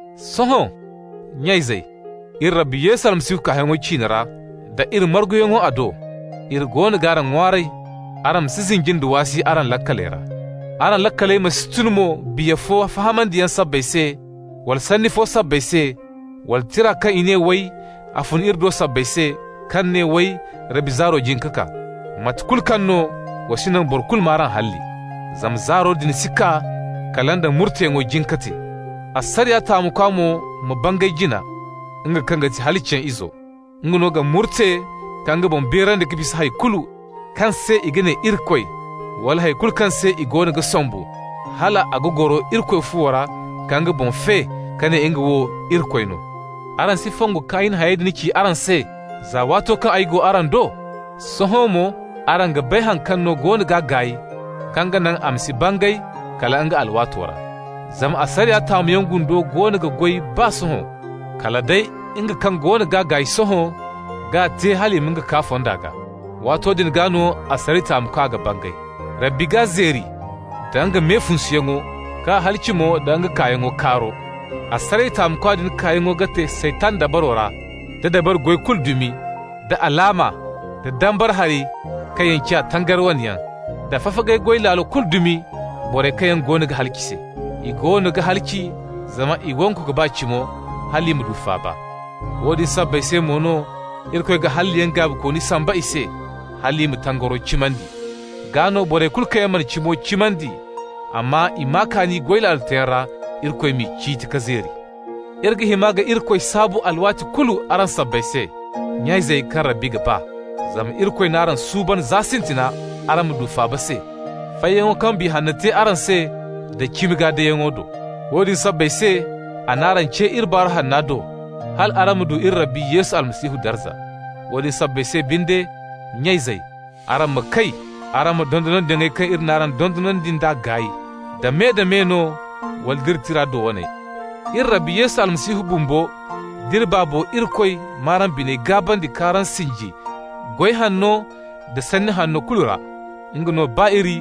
Sohõ, nya-izey, iri Rabbi Yesu Almasihu kaayaŋo ciine ra, da iri marguyaŋo a do, iri goono g'araŋ ŋwaaray araŋ ma si zinji nda waasi araŋ laakaley ra. Araŋ laakaley ma si tun mo biya fo fahamandiyaŋ sabbay se, wala sanni fo sabbay se, wala tira kaŋ i ne, way, a fun iri do sabbay se, kaŋ ne, way, Rabbi zaaro jin ka kaa. Mate kulu kaŋ no, wa si naŋ boro kulu m'araŋ halli. Zama zaaro din si kaa kala nda murteyaŋo jin ka te. Asariya taamukwa mo ma bangay jina, nga kaŋ ti halaciyaŋ izo. Nga no ga murte ka nga boŋ beerandi ka bisa hay kulu kaŋ se i ga ne irikoy, wala hay kulu kaŋ se i goono ga sombu, hal a ga goro Irikoy fuwo ra, ka nga boŋ fe ka ne nga wo Irikoy no. Araŋ si fongu kaŋ ay na hayey din ci araŋ se za waato kaŋ ay go araŋ do? Sohõ mo araŋ ga bay haŋ kaŋ no goono g'a gaay, kaŋ ga naŋ a ma si bangay kala nga alwaato ra. Zama asariya taamuyaŋ gundo goono ga goy baa sohõ. Kala day nga kaŋ goono g'a gaay sohõ g'a te hal i ma nga kaa fonda gaa. Waato din gaa no asariya taamukwa ga bangay. Rabbi g'a zeeri nda nga me funsuyaŋo k'a halaci mo da nga kaayaŋo kaaro. Asariya taamukwa din kaayaŋo ga te Saytan dabaro ra, da dabari goy kulu dumi, da alaama, da dambara hari kaŋ yaŋ ciya tangari wane yaŋ, da fafagay goy laalo kulu dumi borey kaŋ yaŋ goono ga halaci se. I goono ga halaci zama i wangu ka ba cimo hal i ma du faaba. Woodin sabbay se mo no Irikoy ga halliyaŋ gaabikooni samba i se hal i ma tangaro cimandi. Gaa no borey kulu kaŋ yaŋ mana cimo cimandi, amma i maa kaani goy laalo teeyaŋ ra, Irikoy m'i ciiti ka zeeri. Iri ga hima ka Irikoy saabu alwaati kulu araŋ sabbay se, nya-izey kaŋ Rabbi ga ba. Zama Irikoy n'araŋ suuban za sintina araŋ ma du faaba se, fayyaŋo kaŋ Biya Hanno te araŋ se da cimi gaa deyaŋo do. Woodin sabbay se a n'araŋ ce iri Baaru Hanna do hal araŋ ma du iri Rabbi Yesu Almasihu darza. Woodin sabbay se binde, nya-izey, araŋ ma kay, araŋ ma dondonandiyaŋey kaŋ iri n'araŋ dondonandi nd'a gaay, da me-da-me no wala nd'iri tira do waney. Iri Rabbi Yesu Almasihu bumbo d'iri Baabo Irikoy m'araŋ biney gaabandi k'araŋ sinji goy hanno nda sanni hanno kulu ra. Nga no ba iri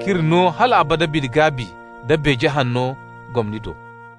k'iri no hal abada bine-gaabi nda beeje hanno gomni do.